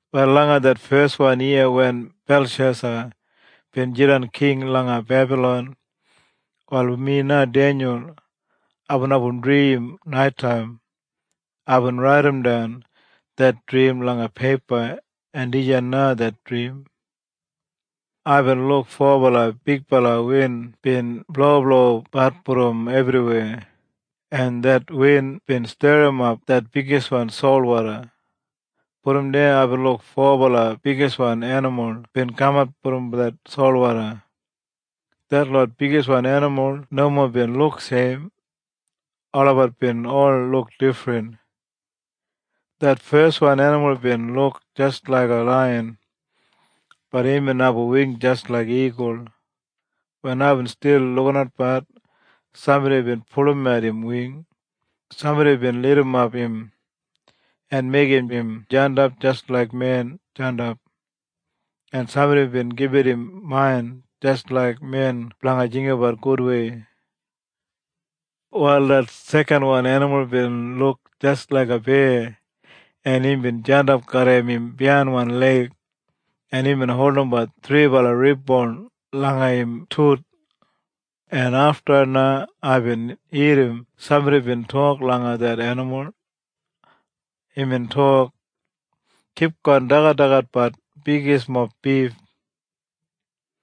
Wal langa det feswan yiya wen Belshesa bin jidan king langa Bebalon, wal mi na Denyul, aibin abum drim naitaim. Aibin raidimdan det drim langa peipa, en dijan na det drim. Aibin luk fobala bigbala win bin bloblobat brom ebriweya, en det win bin sterrimap det bigiswan solwoda. Brom deya aibin luk fobala bigiswan enimul bin kamat brom det solwoda. Detlot bigiswan enimul nomo bin luk seim. Olabat bin ol luk difrin. Det feswan enimul bin luk jis laiga laiyan, bat imbin abum wing jis laik igul. Wen aibin stil lukinatbat, sambodi bin pulumat im wing. Sambodi bin lidimap im, en meigim im jandap jis laik men jandap, en sambodi bin gibit im main jis laik men blanga jinggabat gudwei. Wal det sekanwan enimul bin luk jis laiga beya, en imbin jandap garram im biyainwan leig, en imbin holdimbat thribala rib boun langa im tuth, en afta na aibin irrim sambodi bin tok langa det enimul. Imbin tok, “Kipgon dagadagatbat bigismob bif.”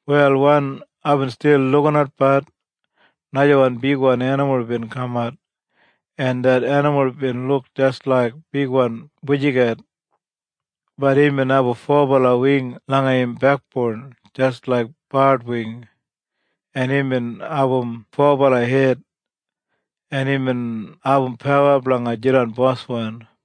Wal wen aibin stil lukinatbat, najawan bigwan enimul bin kamat, en det enimul bin luk jis laik bigwan bujiget, bat imbin abum fobala wing langa im bekboun jis laik bard wing, en imbin abum fobala hed, en imbin abum pawa blanga jidan boswan.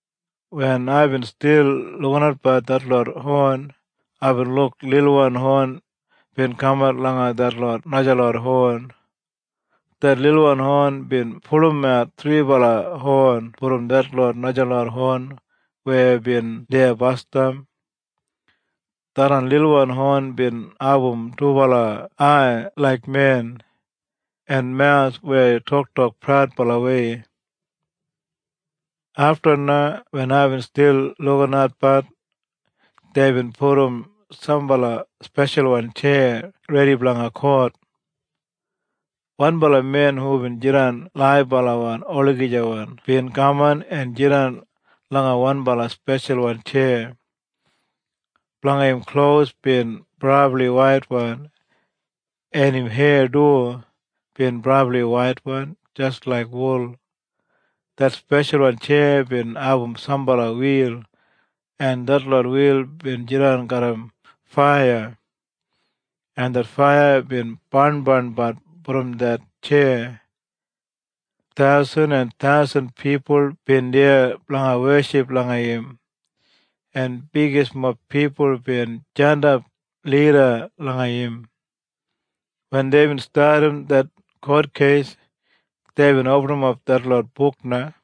Wen aibin stil lukinatbat detlot hon, aibin luk lilwan hon bin kamat langa detlot najalot hon. Det lilwan hon bin pulumat thribala hon brom detlot najalot hon weya bin deya basdam. Tharran lilwan hon bin abum dubala ai laik men, en mawus weya toktok praudbalawei. Afta na wen aibin stil lukinatbat, deibin pudum sambala speshalwan tjeya redi blanga kot. Wanbala men hubin jidan laibala olagijawan bin kaman en jidan langa wanbala speshalwan tjeya. Blanga im klos bin brabli waitwan, en im heya du bin brabli waitwan jis laik wul. Det speshalwan tjeya bin abum sambala wil en detlot wil bin jidan garram faiya, en det faiya bin barnbarnbat brom det tjeya. Thausen en thausen pipul bin deya blanga weship langa im, en bigismob pipul bin jandap lida langa im. Wen deibin stadim det kotkeis, deibin opinap detlot buk na.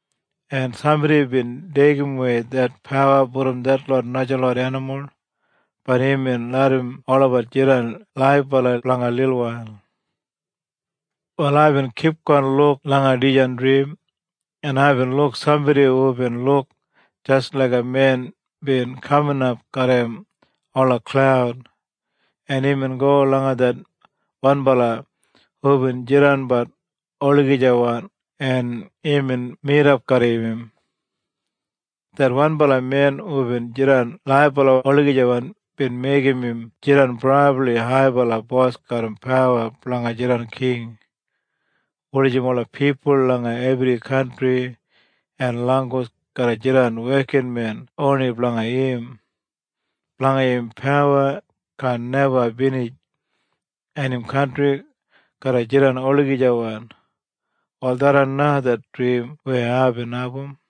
En sambodi bin deigimwei det pawa brom detlot najalot enimul, bat imbin larram olabat jidan laibala blanga lilwail. Wal aibin kipgon luk langa dijan drim, en aibin luk sambodi hubin luk jis laiga men bin kaminap garram ola klaud, en imbin go langa det wanbala hubin jidanbat olagijawan en imbin midap garram im. Det wanbala men hubin jidan laibala olagijawan bin meigim im jidan brabli haibala bos garram pawa blanga jidan king, wulijim ola pipul langa ebri kantri en langgus garra jidan wekinmen oni blanga im. Blanga im pawa kaan neba binij, en im kantri garra jidan olagijawan. Wal tharran na det drim weya aibin abum.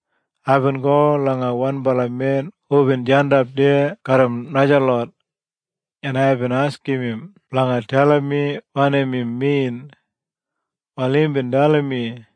Aibin go langa wanbala men hubin jandap deya garram najalot, en aibin askim im blanga dalim mi wanim im min. Wal imbin dalim mi,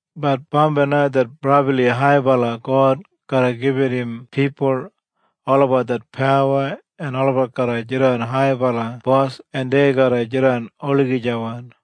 Bat bambai det Brabli Haibala God garra gibit im pipul olabat det pawa en olabat garra jidan haibala bos en dei garra jidan olagijawan.”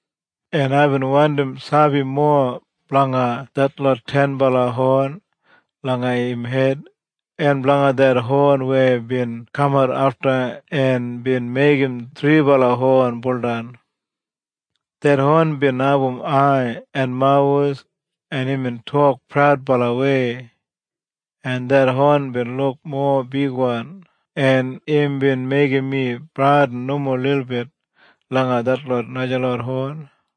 En aibin wandim sabi mowa blanga detlot tenbala hon langa im hed, en blanga det hon weya bin kamat afta en bin meigim thribala hon buldan. Det hon bin abum ai en mawus en imbin tok praudbalawei, en det hon bin luk mowa bigwan en imbin meigim mi bradin nomo lilbit langa detlot najalot hon.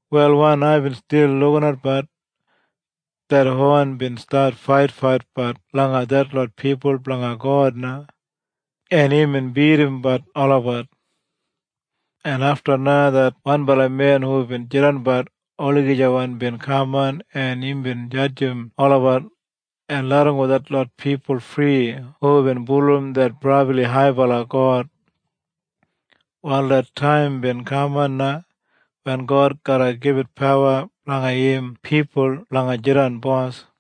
Wal wen aibin stil lukinatbat, det hon bin stat faitfaitbat langa detlot pipul blanga God na, en imbin bidimbat olabat. Afta na det wanbala men hubin jidanbat olagijawan bin kaman en imbin jadjim olabat en larramgo detlot pipul fri hubin bulurrum det Brabli Haibala God. Wal det taim bin kaman na wen God garra gibit pawa blanga im pipul blanga jidan bos.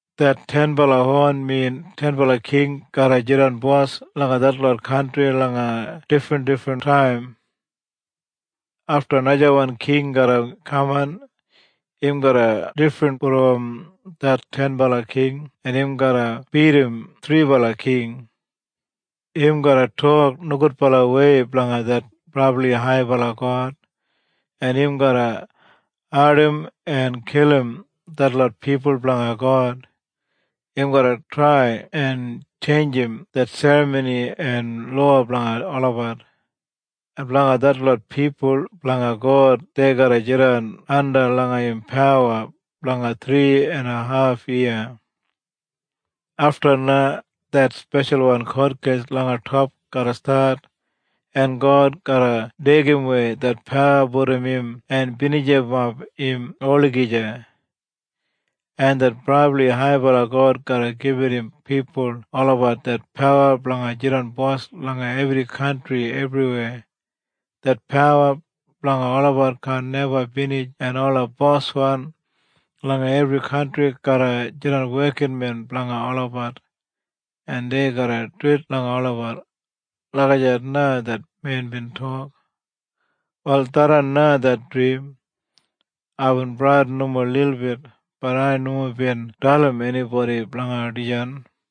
Det tenbala hon min tenbala king garra jidan bos langa detlot kantri langa difrindifrin taim. Afta najawan king garra kaman. Im garra difrin brom det tenbala king en im garra bidim thribala king. Im garra tok nogudbalawei blanga det Brabli Haibala God, en im garra ardim en kilim detlot pipul blanga God. Im garra trai en tjeinjim det serramoni en lowa blanga olabat. En blanga detlot pipul blanga God dei garra jidan anda langa im pawa blanga thri en haf yiya. Afta na det speshalwan kotkeis langa top garra stat en God garra deigidawei det pawa brom im en binijimap im olagija. En det Brabli Haibala God garra gibit im pipul olabat det pawa blanga jidan bos langa ebri kantri ebriweya. Det pawa blanga olabat kaan neba binij en ola boswan langa ebri kantri garra jidan wekinmen blanga olabat en dei garra duwit langa olabat.” Lagijat na det men bin tok. Wal tharran na det drim. Aibin bradin nomo lilbit, bat ai nomo bin dalim enibodi blanga dijan.